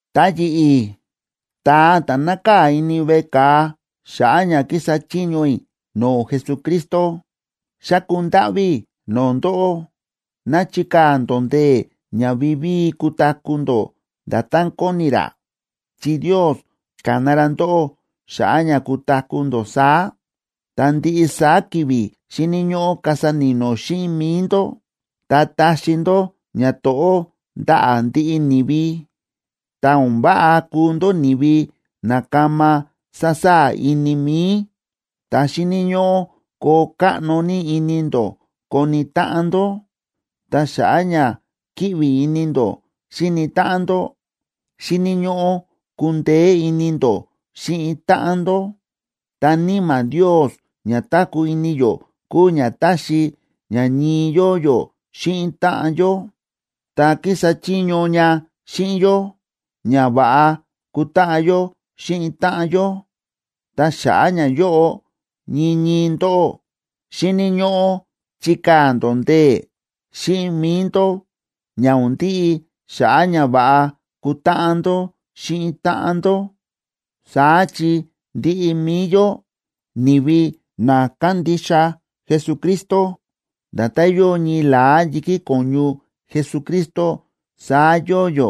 Ta yi̱ꞌi̱, ta̱a ta̱ nákaa̱ ini veꞌe ka̱a xa̱ꞌa̱ ña kísa chiño i̱ no̱o̱ Jesucristo, xáku ndáꞌví i̱ no̱o̱ ndóꞌó ná chikaa̱ ndó ndee̱ ña vivíi kutaku̱ ndó nda̱tán kóni ra, chi Ndios ka̱na ra ndóꞌó xa̱ꞌa̱ ña kutaku̱ ndó saá. Ta ndiꞌi saá ki̱vi̱ xíni̱ ñóꞌó kasa ni̱no̱ xíꞌin mi̱i ndó ta taxi ndó ñato̱ꞌó ndaꞌa̱ ndiꞌi ni̱vi. Ta o̱n váꞌa kuu ndó ni̱vi na kama sasaa̱ ini mi̱i, ta xíni̱ ñóꞌó koo káꞌno ní ini ndó koni táꞌan ndó, ta xa̱ꞌa̱ ña kíꞌvi ini ndó xíni táꞌan ndó, xíni̱ ñóꞌó kundeé ini ndó xíꞌin táꞌan ndó. Ta Níma̱ Ndios ña táku̱ ini yó kúu ña táxi ña ñii yóo yó xíꞌin táꞌan yó, ta kísa chiño ña xíꞌin yó ña va̱ꞌa kutáꞌan yó xíꞌin táꞌan yó. Ta xa̱ꞌa̱ ñayóꞌo, ñii ñii ndóꞌó, xíni̱ ñóꞌó chikaa̱ ndó ndee̱ xíꞌin mi̱i ndó ña o̱n ndiꞌi xa̱ꞌa̱ ña va̱ꞌa kutáꞌan ndó xíꞌin táꞌan ndó. Saá chi ndiꞌi mi̱i yó, ni̱vi na kándixa Jesucristo, nda̱tán yóo ñii la̱á yi̱kí ko̱ñu Jesucristo saá yóo yó.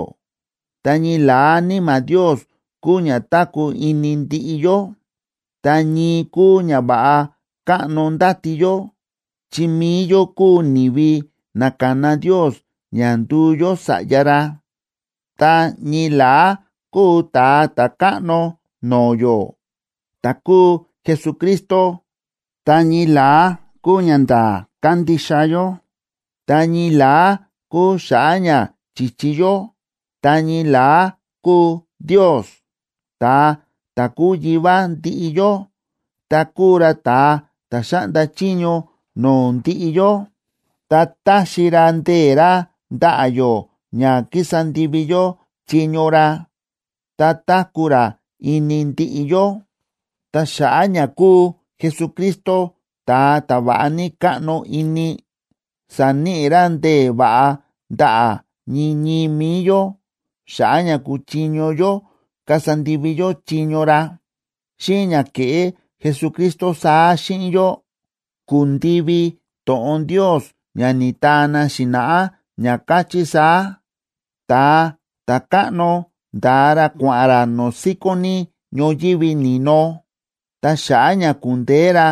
Ta ñii la̱á Níma̱ Ndios kúu ña táku̱ ini ndiꞌi yó, ta ñii kúu ñava̱ꞌa káꞌno ndáti yó, chi mi̱i yó kúu ni̱vi na ka̱na Ndios ña nduu yó sa̱ꞌya ra. Ta ñii la̱á kúu Ta̱a Ta̱káꞌno no̱o̱ yó, ta̱ kúu Jesucristo, ta ñii la̱á kúu ñanda̱a̱ kándixa yó, ta ñii la̱á kúu xa̱ꞌa̱ ña chi̱chi yó, ta ñii la̱á kúu Ndios, ta̱a ta̱ kúu Yivá ndiꞌi yó, ta kúu ra ta̱a ta̱ xáꞌnda chiño no̱o̱ ndiꞌi yó, ta táxi ra ndee̱ ra ndaꞌa̱ yó ña kísa ndivi yó chiño ra, ta táku̱ ra ini ndiꞌi yó. Ta xa̱ꞌa̱ ña kúu Jesucristo ta̱a ta̱ va̱ꞌa ní káꞌno ini, sa̱níꞌi ra ndee̱ va̱ꞌa ndaꞌa̱ ñii ñii mi̱i yó xa̱ꞌa̱ ña kuchiño yó kasa ndivi yó chiño ra. Xíꞌin ña ke̱ꞌé Jesucristo saá xíꞌin yó, ku̱ndivi to̱ꞌon Ndios ña ni̱taa na xi̱na̱ꞌá, ña káchí saá: Ta̱a ta̱káꞌno nda̱a ra kua̱ꞌa̱n ra no̱o̱ síkón ní ñoyívi ni̱no, ta xa̱ꞌa̱ ña ku̱ndeé ra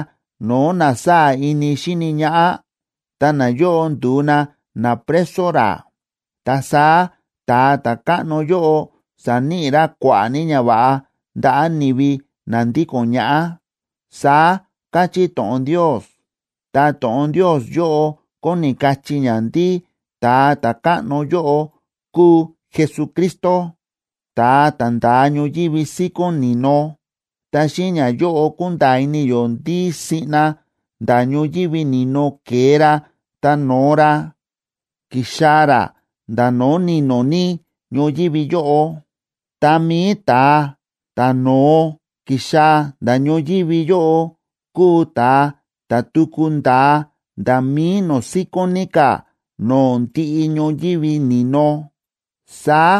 no̱o̱ na sáa̱ ini xíni ñaꞌá, ta nayóꞌo ndu̱u na napreso ra. Ta saá ta̱a ta̱káꞌno yóꞌo sa̱níꞌi ra kua̱ꞌa̱ ní ñava̱ꞌa ndaꞌa̱ ni̱vi na ndíko̱n ñaꞌá, saá káchí to̱ꞌon Ndios. Ta to̱ꞌon Ndios yóꞌo kóni kachí ña ndí Ta̱a Ta̱káꞌno yóꞌo kúu Jesucristo, ta̱a ta̱ nda̱a ñoyívi síkón ni̱no. Ta xíꞌin ñayóꞌo kúnda̱a̱ ini yó ndí siꞌna nda̱ ñoyívi ni̱no ke̱e ra ta no̱o ra, ki̱xaa̱ ra nda̱ no̱o̱ ni̱no̱ ní ñoyívi yóꞌo. Ta mi̱i ta̱a ta̱ no̱o ki̱xaa̱ nda̱ ñoyívi yóꞌo kúu ta̱a ta̱ tuku nda̱a nda̱ mi̱i no̱o̱ síkón ní ka̱ no̱o̱ ndiꞌi ñoyívi ni̱no. Saá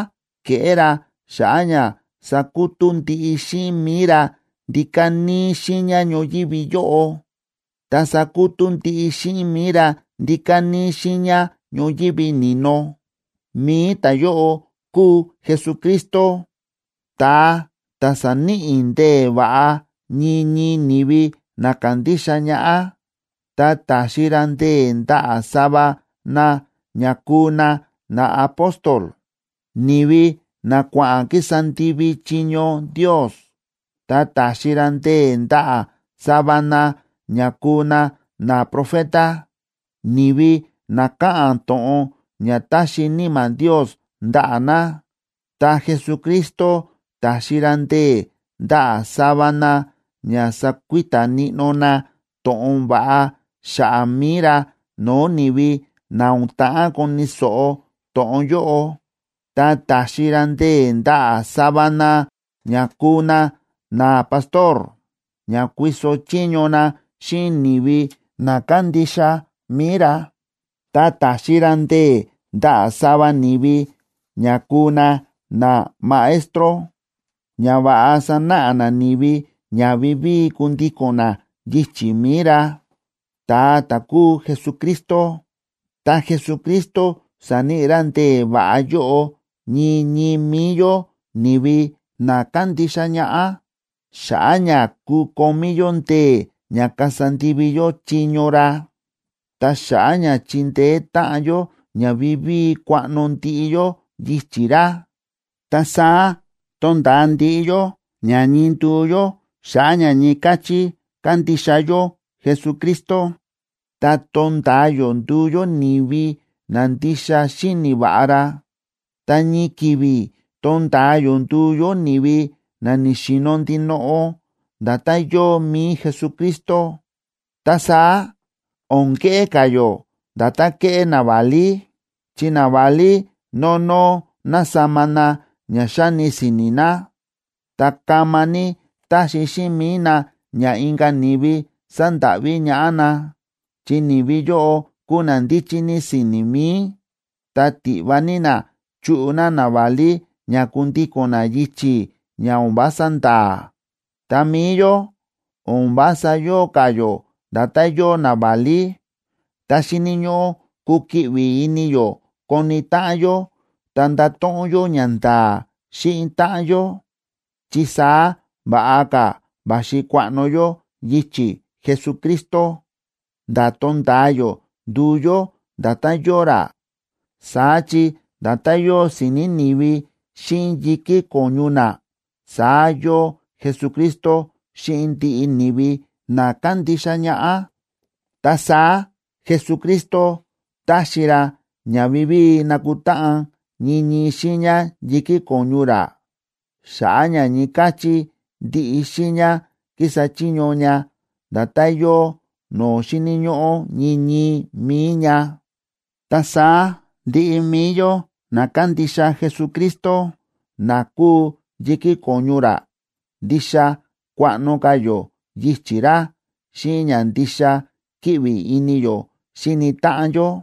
ke̱ꞌé ra xa̱ꞌa̱ ña sakutú ndiꞌi xíꞌin mi̱i ra ndíka̱ níí xiiña ñoyívi yóꞌo, ta sakutú ndiꞌi xíꞌin mi̱i ra ndíka̱ níí xiiña ñoyívi ni̱no. Mi̱i ta̱yóꞌo kúu Jesucristo, ta̱a ta̱ sa̱níꞌi ndee̱ va̱ꞌa ñii ñii ni̱vi na ka̱ndixa ñaꞌá. Ta ta̱xi ra ndee̱ ndaꞌa̱ sava na ña kuu na naapóstol, ni̱vi na kua̱ꞌa̱n kísa ndivi chiño Ndios; ta ta̱xi ra ndee̱ ndaꞌa̱ sava na ña kuu na naprofeta, ni̱vi na káꞌa̱n to̱ꞌon ña táxi Níma̱ Ndios ndaꞌa̱ na; ta Jesucristo ta̱xi ra ndee̱ ndaꞌa̱ sava na ña sakuita níꞌnó na to̱ꞌon va̱ꞌa xa̱ꞌa̱ mi̱i ra no̱o̱ ni̱vi na o̱n ta̱ꞌán koni̱ so̱ꞌo to̱ꞌon yóꞌo, ta ta̱xi ra ndee̱ ndaꞌa̱ sava na ña kuu na napastor, ña kuiso chiño na xíꞌin ni̱vi na kándixa mi̱i ra. Ta ta̱xi ra ndee̱ ndaꞌa̱ sava ni̱vi ña kuu na namaestro, ña va̱ꞌa sanáꞌa na ni̱vi ña vivíi kundíko̱n na yichi̱ mi̱i ra, ta̱a ta̱ kúu Jesucristo. Ta Jesucristo sa̱níꞌi ra ndee̱ va̱ꞌa yóꞌo ñii ñii mi̱i yó ni̱vi na kándixa ñaꞌá, xa̱ꞌa̱ ña kukomí yó ndee̱ ña kasa ndivi yó chiño ra, ta xa̱ꞌa̱ ña chindeé táꞌan yó ña vivíi kuaꞌno ndiꞌi yó yichi̱ ra. Ta saá tonda̱a ndiꞌi yó ña ñii nduu yó xa̱ꞌa̱ ña ñii káchí kándixa yó Jesucristo, ta tonda̱a yó nduu yó ni̱vi na ndixa xíni̱ va̱ꞌa ra, ta ñii ki̱vi̱ tonda̱a yó nduu yó ni̱vi na ni̱xi̱no̱ ndinoꞌo, nda̱tán yóo mi̱i Jesucristo. Ta saá o̱n keꞌé ka̱ yó nda̱tán kéꞌé naválí, chi naválí nónó násama na ña xáni si̱ni̱ na, ta kama ní táxi xíꞌin mi̱i na ña inka̱ ni̱vi sandáꞌví ñaꞌá na, chi ni̱vi yóꞌo kúu na ndíchí ní si̱ni̱ mi̱i, ta tiꞌva ní na chuꞌu na naválí ña kundíko̱n na yichi̱ ña o̱n vása nda̱a̱. Ta mi̱i yó, o̱n vása yóo ka̱ yó nda̱tán yóo naválí, ta xíni̱ ñóꞌó kukiꞌvi ini yó koni táꞌan yó ta ndato̱ꞌon yó ñanda̱a̱ xíꞌin táꞌan yó, chi saá va̱ꞌa ka̱ va̱xi kuaꞌno yó yichi̱ Jesucristo, nda̱ tonda̱a yó nduu yó nda̱tán yóo ra. Saá chi nda̱tán yóo si̱ni̱ ni̱vi xíꞌin yi̱kí ko̱ñu na, saá yóo Jesucristo xíꞌin ndiꞌi ni̱vi na kándixa ñaꞌá. Ta saá Jesucristo táxi ra ña vivíi nakutáꞌan ñii ñii xiiña yi̱kí ko̱ñu ra, xa̱ꞌa̱ ña ñii káchí ndiꞌi xiiña kísa chiño ña nda̱tán yóo no̱o̱ xíni̱ ñóꞌó ñii ñii mi̱i ña. Ta saá ndiꞌi mi̱i yó na kándixa Jesucristo, na kúu yi̱kí ko̱ñu ra, ndixa kuaꞌno ka̱ yó yichi̱ ra xíꞌin ña ndixa kíꞌvi ini yó xíni táꞌan yó.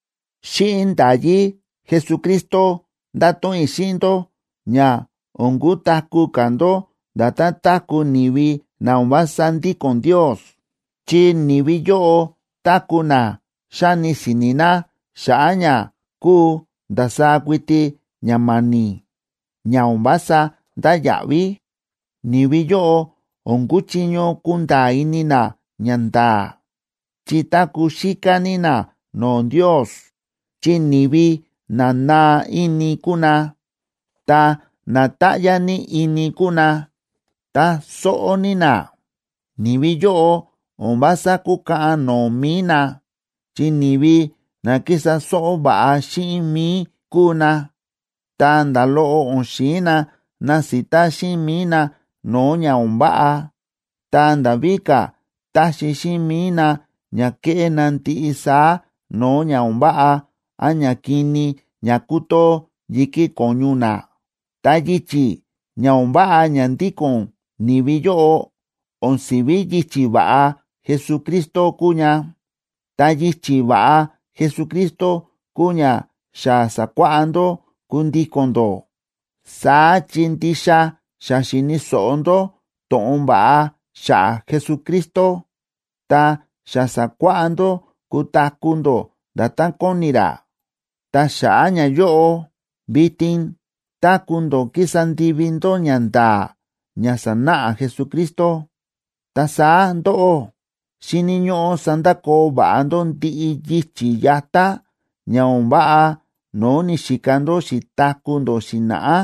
Xíꞌin nda̱yí Jesucristo ndáto̱ꞌon i̱ xíꞌin ndó ña o̱n kutaku̱ ka̱ ndó nda̱tán táku̱ ni̱vi na o̱n vása ndíko̱n Ndios, chi ni̱vi yóꞌo táku̱ na xáni si̱ni̱ na xa̱ꞌa̱ ña kúu ndasaá kuiti ña ma̱ni̱, ña o̱n vása ndáya̱ꞌví. Ni̱vi yóꞌo o̱n kúchiño kunda̱a̱ ini na ñanda̱a̱, chi táku̱ xíká ní na no̱o̱ Ndios, chi ni̱vi na naa ini kúu na, ta na táꞌyá ní ini kúu na, ta sóꞌó ní na. Ni̱vi yóꞌo o̱n vása kúkaꞌan no̱o̱ mi̱i na, chi ni̱vi na ki̱sa sóꞌó va̱ꞌa xíꞌin mi̱i kúu na, ta nda̱ loꞌo o̱n xi̱in na nasita xíꞌin mi̱i na no̱o̱ ña o̱n váꞌa. Ta nda̱ víka̱ táxi xíꞌin mi̱i na ña kéꞌé na ndiꞌi saá no̱o̱ ña o̱n váꞌa án ñakini ña kútoo yi̱kí ko̱ñu na. Ta yichi̱ ña o̱n váꞌa ña ndíko̱n ni̱vi yóꞌo, o̱n si̱ví yichi̱ va̱ꞌa Jesucristo kúu ña, ta yichi̱ va̱ꞌa Jesucristo kúu ña xa sa̱kuáꞌá ndó kundíko̱n ndó. Saá chi ndixa xa xi̱ni̱ so̱ꞌo ndó to̱ꞌon va̱ꞌa xa̱ꞌa̱ Jesucristo, ta xa sa̱kuáꞌá ndó kutaku̱ ndó nda̱tán kóni ra. Ta xa̱ꞌa̱ ñayóꞌo, vitin táku̱ ndó kísa ndivi ndó ñanda̱a̱ ña sa̱náꞌa Jesucristo. Ta saá ndóꞌó, xíni̱ ñóꞌó sandakoo va̱ꞌa ndó ndiꞌi yichi̱ yatá ña o̱n váꞌa no̱o̱ ni̱xika ndó xi̱taku̱ ndó xi̱na̱ꞌá,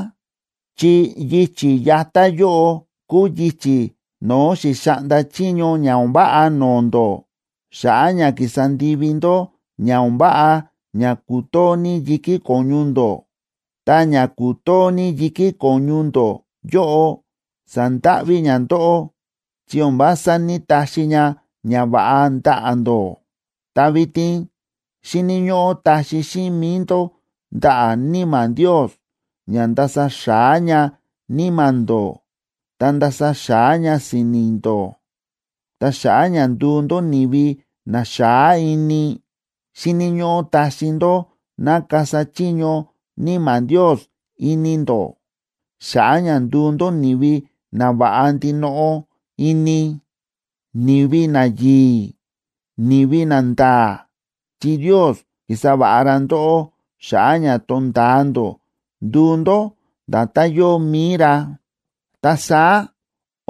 chi yichi̱ yatá yóꞌo kúu yichi̱ no̱o̱ xi̱xaꞌnda chiño ña o̱n váꞌa no̱o̱ ndó xa̱ꞌa̱ ña ki̱sa ndivi ndó ña o̱n váꞌa ña kútoo ní yi̱kí ko̱ñu ndó. Ta ña kútoo ní yi̱kí ko̱ñu ndó yóꞌo sa̱ndáꞌví ña ndóꞌó chi o̱n vása ní‑taxi ña ñava̱ꞌa ndaꞌa̱ ndó. Ta vitin xíni̱ ñóꞌó taxi xíꞌin mi̱i ndó ndaꞌa̱ Níma̱ Ndios ña ndasa xa̱á ña níma̱ ndó ta ndasa xa̱á ña si̱ni̱ ndó. Ta xa̱ꞌa̱ ña nduu ndó ni̱vi na xa̱á ini, xíni̱ ñóꞌó taxi ndó ná kasa chiño Níma̱ Ndios ini ndó, xa̱ꞌa̱ ña nduu ndó ni̱vi nava̱ꞌa ndinoꞌo ini, ni̱vi nayi̱i̱, ni̱vi nanda̱a̱, chi Ndios ki̱sa va̱ꞌa ra ndóꞌó xa̱ꞌa̱ ña tonda̱a ndó nduu ndó nda̱tán yóo mi̱i ra. Ta saá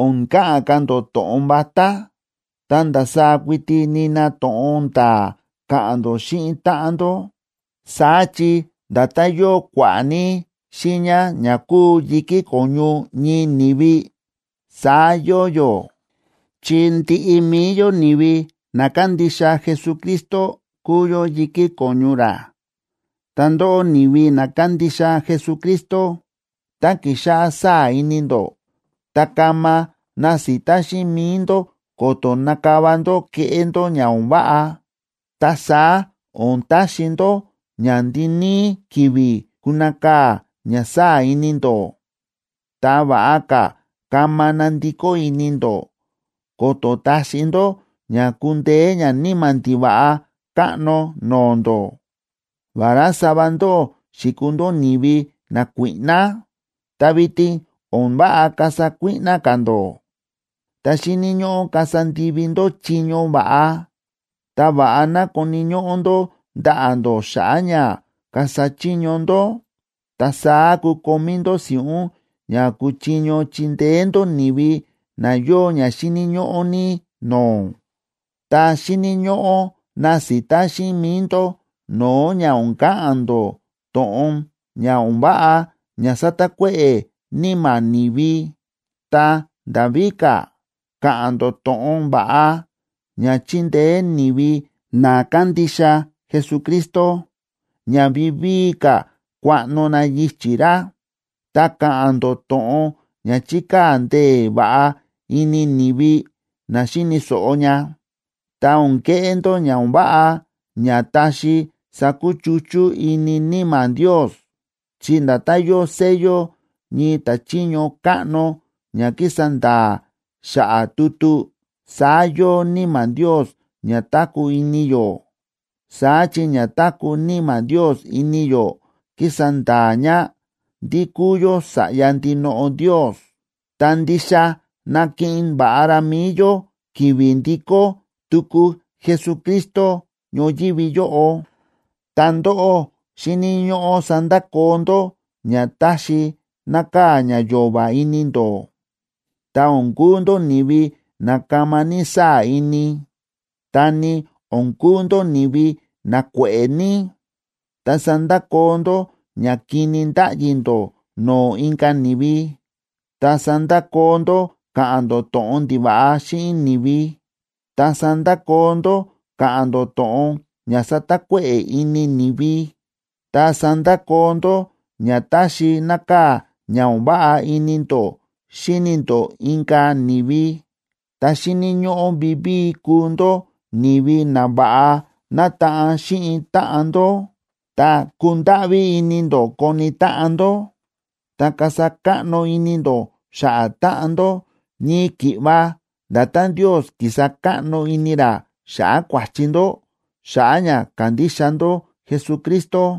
o̱n ka̱ꞌa̱n ka̱ ndó to̱ꞌon vatá, ta ndasaá kuiti nina to̱ꞌon nda̱a̱ ka̱ꞌa̱n ndó xíꞌin táꞌan ndó. Saá chi nda̱tán yóo kua̱ꞌa̱ ní xiiña ña kúu yi̱kí ko̱ñu ñii ni̱vi, saá yóo yó, chi ndiꞌi mi̱i yó, ni̱vi na kándixa Jesucristo kúu yó yi̱kí ko̱ñu ra. Ta ndóꞌó, ni̱vi na kándixa Jesucristo, tá kixáꞌá saa̱ ini ndó, ta kama nasita xíꞌin mi̱i ndó ko̱to̱ nakava ndó keꞌé ndó ña o̱n váꞌa. Ta saá o̱n taxi ndó ña ndiníí ki̱vi̱ kunakaa̱ ña sáa̱ ini ndó. Ta va̱ꞌa ka̱ kama nandikó ini ndó, ko̱to̱ taxi ndó ña kundeé ñaníma̱ ndiva̱ꞌa káꞌno no̱o̱ ndó. Vará sava ndóꞌó xi̱kuu ndó ni̱vi nakuíꞌná, ta vitin o̱n váꞌa kasa kuíꞌná ka̱ ndó, ta xíni̱ ñóꞌó kasa ndivi ndó chiño va̱ꞌa, ta va̱ꞌa ná koni̱ ñóꞌó ndó ndaꞌa̱ ndó xa̱ꞌa̱ ña kasa chiño ndó. Ta saá kukomí ndó si̱ꞌún ña kuchiño chindeé ndó ni̱vi na yóo ña xíni̱ ñóꞌó ní no̱o̱. Ta xíni̱ ñóꞌó nasita xíꞌin mi̱i ndó no̱o̱ ña o̱n ka̱ꞌa̱n ndó to̱ꞌon ña o̱n váꞌa ña satakuéꞌe̱ níma̱ ni̱vi. Ta nda̱ víka̱, ka̱ꞌa̱n ndó to̱ꞌon va̱ꞌa ña chindeé ni̱vi na kándixa Jesucristo ña vivíi ka̱ kuaꞌno na yichi̱ ra. Ta ka̱ꞌa̱n ndó to̱ꞌon ña chikaa̱ ndee̱ va̱ꞌa ini ni̱vi na xíni̱ so̱ꞌo ña. Ta o̱n keꞌé ndó ña o̱n váꞌa ña taxi sakuchuchú ini Níma̱ Ndios, chi nda̱tán yóo sello ñii ta̱chiño káꞌno ña kísa nda̱a̱ xa̱ꞌa̱ tutu, saá yóo Níma̱ Ndios ña táku̱ ini yó. Saá chi ña táku̱ Níma̱ Ndios ini yó kísa nda̱a̱ ña ndí kúu yó sa̱ꞌya ndinoꞌo Ndios, ta ndixa nakiꞌin va̱ꞌa ra mi̱i yó ki̱vi̱ ndikó tuku Jesucristo ñoyívi yóꞌo. Ta ndóꞌó xíni̱ ñóꞌó sandakoo ndó ña táxi nákaa̱ ña yo̱va̱ ini ndó, ta o̱n kuu ndó ni̱vi na kama ní sáa̱ ini, ta ni o̱n kuu ndó ni̱vi na kue̱ꞌe̱ ní. Ta sandakoo ndó ña kini ndáꞌyi ndó no̱o̱ inka̱ ni̱vi, ta sandakoo ndó káꞌa̱n ndó to̱ꞌon ndiva̱ꞌa xíꞌin ni̱vi, ta sandakoo ndó káꞌa̱n ndó to̱ꞌon ña satakuéꞌe̱ ini ni̱vi, ta sandakoo ndó ña táxi nákaa̱ ña o̱n váꞌa ini ndó xíni ndó inka̱ ni̱vi. Ta xíni̱ ñóꞌó vivíi kuu ndó ni̱vi na va̱ꞌa nataꞌan xíꞌin táꞌan ndó, ta kundáꞌví ini ndó koni táꞌan ndó, ta kasa káꞌno ini ndó xa̱ꞌa̱ táꞌan ndó, ñii ki̱ꞌva nda̱tán Ndios ki̱sa káꞌno ini ra xa̱ꞌa̱ kua̱chi ndó xa̱ꞌa̱ ña ka̱ndixa ndó Jesucristo.